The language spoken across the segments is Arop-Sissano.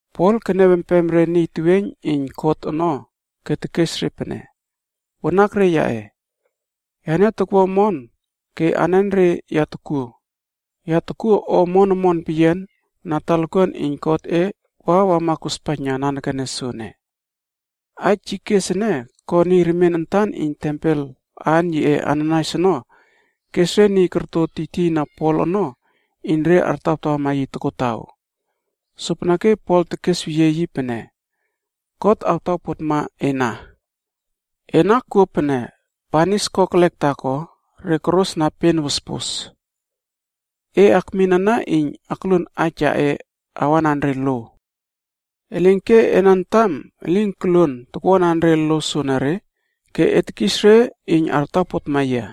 Pol keniaw empem re niy teweiyn iyn kot ono ke tekes re pene, “Wanakre yaꞌe, yane tokwua omon ke anenre ya tokuo, ya tokuo omon omon peyian na talakuan iyn Godꞌe wa wama kospaijna nanekene soene.” Aij yi kes ene ko niy remien antan iyn tempel aan yiꞌe Ananaias ono kes re niy korto tiytiyna Pol ono iyn re artawtawama yi tokotaw. Sopeneke Pol tekesweyie yi pene, “God awtawpotma ena. Ena kuo pene banis kokelek taako re korosna pen wospos. E akmin ana iyn akluon aij yaꞌe awanan re lo. Elinke ena antam elin koluon takwuanan re lo soenere ke e tekis re iyn artaw potma yia.”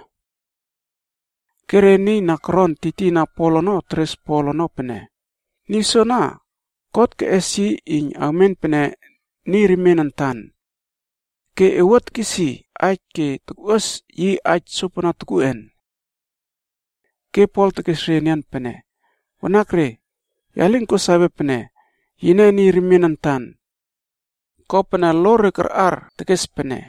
Ke re niy na koron tiytiyna Pol ono teres Pol ono pene, “Niy soana God keꞌes yi iyn awmen pene niy remien antan. Ke e wua tekis aij ke tokꞌuas yi aij sopana tokuꞌen?” Ke Pol tekes re enian pene, “Wanakre, ya lin ko sawe pene yine niy remien antan. Kopene lo re karꞌar tekes pene,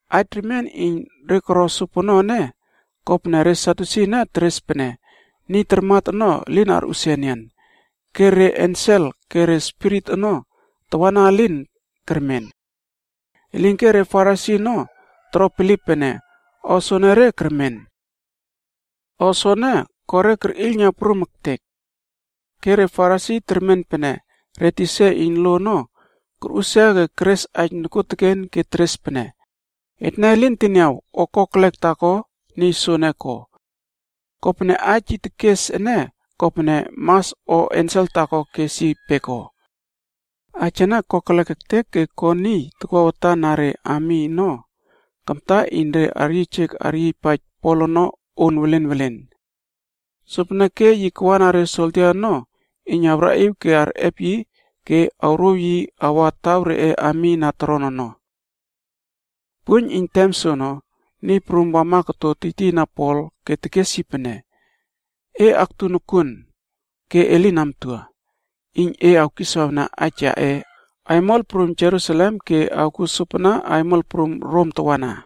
Aij remien iyn re koro sopono ene kopene re Sadyusi ene teres pene niy tarmat ono elin arꞌusia enian. Ke re ensel ke re spirit ono tawana elin kermen. Elinke re Farisi ono toro bilip pene o soenere kermen. O soene ko re kerꞌiylna prum ektek. Ke re Farisi termen pene re tisa iyn lo ono korꞌusia ke keres aij nokuoteken ke teres pene, “Etne lin teniaw o kokelek taako niy soene ko. Kopene aij yi tekes ene kopene mas o ensel taako kes yi peko.” Aij ene kokelek ektek ke ko niy takwa watan na re ami ono kamta iyn re aryiyjek aryiypaij Pol ono on welen welen. Sopeneke yi kawna re soldia ono iyn awraꞌiw ke arꞌep yi ke awrouw yi awa taw reꞌe ami na toron ono. Puiyn iyn tem soono, Niy Prum wama koto tiytiyna Pol ke tekes yi pene, “E aktu nokuon ke e lin amtua, iyn e kiswawna aij yaꞌe aimol prum Jerusalem ke e awkuo sopana aimol prum Rom tawana.”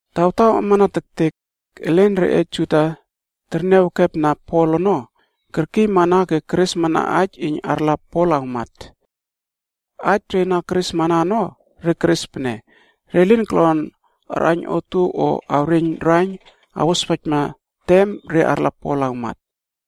Tawtaw amana tektek, elen reꞌe Juda na terniaw ekepna Pol ono kerkiymana ke keresmana aij iyn arla Pol awmat. Aij re na keresmana ono, re keres pene re lin kolon arꞌaiyn otuow o awreiyn raiyn awospaijna tem re arla Pol awmat.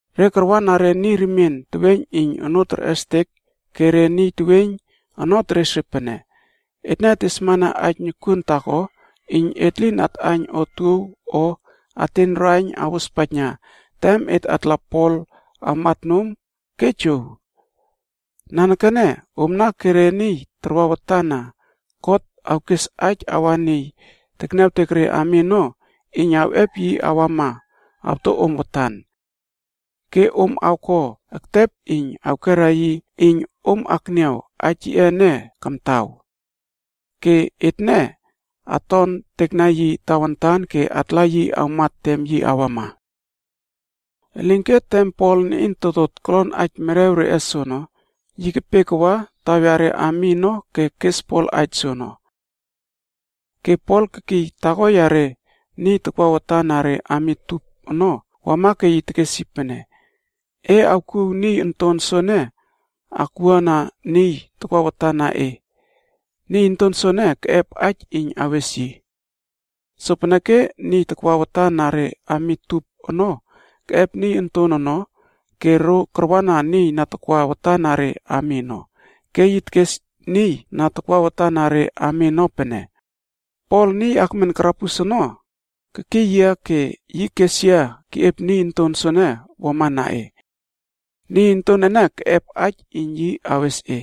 Re karwana re niy remien teweiyn iyn onoo terꞌestek ke re niy teweiyn ono teres re pene, “Etne tesmana aij nokuon taako iyn et lin atꞌaiyn otuow o ateiyn raiyn awospaij tem et atla Pol awmat nom ke jow. Nanekene omna ke re niy tarwa watan na kot awkes aij awa niy tekniawtek re ami ono iyn awꞌep yi awama awto om watan. Ke om awko ektep iyn awkera yi iyn om akniaw aij yiꞌe ene kamtaw. Ke etne atontekna yi tawantan ke atla yi awmat tem yi awama.” Elinke tem Pol niꞌin totot kolon aij merew reꞌe soono, yi kepe kawa taw yare ami ono ke kes Pol aij soono. Ke Pol kekiy taako yare niy tarwa watan na re ami tup ono wama ke yi tekes yi pene, “E awkuw niy onton soene akwuana niy takwa watan na e. Niy onton soene, keꞌep aij iyn awes yi.” Sopeneke niy takwa watan na re ami tup ono keꞌep niy onton ono ke ro karwana niy na takwa watan na re ami ono, ke yi tekes niy na takwa watan na re ami ono pene, “Pol niy akmen karabus ono kekiy yia ke yi kes yia keꞌiep niy onton soene wamana e. Niy onton ene keꞌep aij iyn yi awes e.”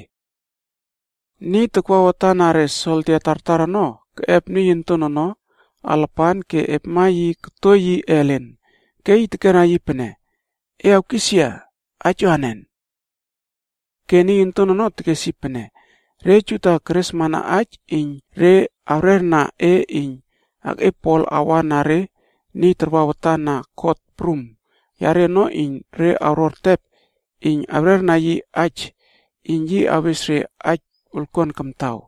Niy takwa watan na re soldia tartar ono keꞌep niy onton ono alapan ke epma yi koto yi ellen, ke yi tekera yi pene, “E awkis yia aij anen?” Ke niy onton ono tekes yi pene, “Re Juda keresmana aij iyn re awrerna e iyn e akꞌiep Pol awa na re niy tarwa watan na kot prum yare ono iyn re awro ertep iyn re awrerna yi aij iyn yi awes re aij wolkuan kamtaw.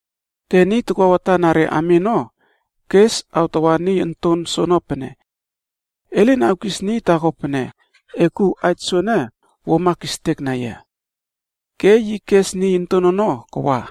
Ke niy takwa watan na re ami ono kes awtawa niy onton soono pene, “E lin awkis niy taako pene e kouw aij soene wuama kistekna yia.” Ke yi kes niy onton ono kawa.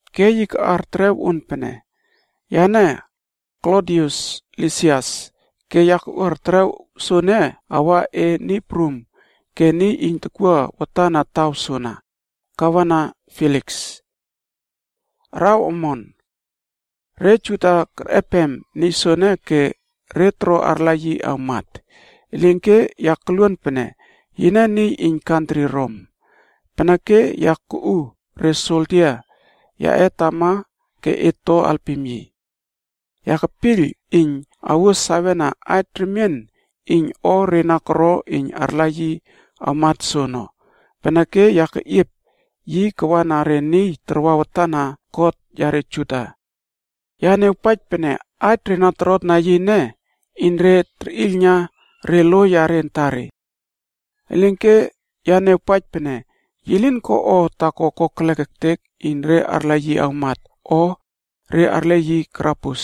Ke yi kaꞌar terew on pene, Yane, Klodius Lisias ke ya kuꞌuar terew soene awa e niy prum ke niy iyn tokwua watan na taw soana, Gavena Feliks. Araw omon. Re Juda kerꞌepem niy soene ke re toro arla yi awmat. Elinke ya koluon pene yine niy iyn kantri Rom. Peneke ya kuꞌu re soldia yaꞌe tama ke et to alpim yi. Ya kepiyl iyn awuo sawena aij remien iyn o re na koro iyn arla yi awmat soono, peneke ya keꞌiep yi kawana re niy tarwa watan na kot yare Juda. Ya niawpaij pene aij re na torotna yi ene iyn re terꞌiylna re lo yare antare. Elinke ya niawpaij pene, yi lin ko o taako kokelek ektek iyn re arla yi awmat o re arle yi karabus.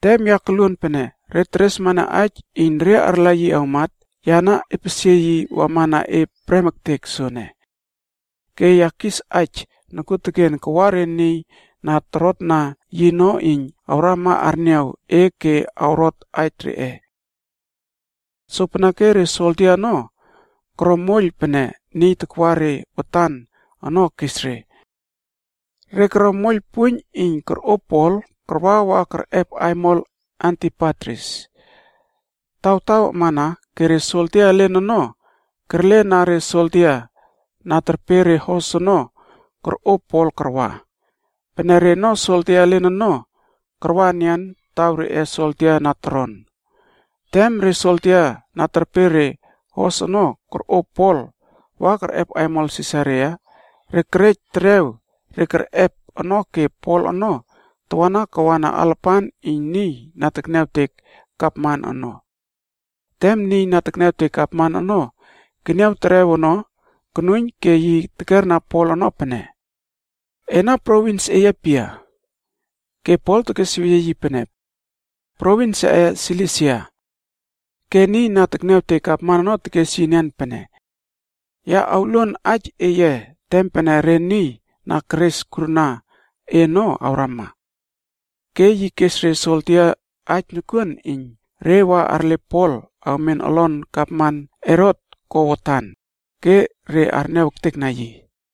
Tem ya koluon pene re teresmana aij iyn re arla yi awmat, ya na epesie yi wamana e prem ektek soene. Ke ya kis aij nokuoteken kawa re niy na torotna yi ono iyn awrama arniaw e ke awrot aij reꞌe. Sopeneke re soldia ono koro moiyl pene niy takwa re watan ono kes re. Re koro moiyl puiyn iyn korꞌo Pol karwa wa kerꞌep aimol Antipatris. Tawtaw amana ke re soldia elen ono kerlena re soldia na terpe re hos ono korꞌo Pol karwa. Pene reno soldia elen ono, karwa enian taw reꞌe soldia na toron. Tem re soldia na terpe re hos ono korꞌo Pol wa kerꞌep aimol Sisaria, re kerej terew re kerꞌep ono ke Pol ono tawana kawana alapan iyn niy na tekniawtek gavman ono. Tem niy na tekniawtek Gavman ono keniaw terew ono konuiyn, ke yi tekerna Pol ono pene, “Ena provins eye pia?” Ke Pol tekesweyie yi pene, “Provins yaꞌe Silisia.” Ke niy na tekniawtek Gavman ono tekes yi enian pene, “Ya awluon aij eye tem pene re niy na keres kurna e ono awrama.” Ke yi kes re soldia aij nokuon iyn re wa arle Pol awmen olon gavman Herot ko watan, ke re arniaw ektekna yi.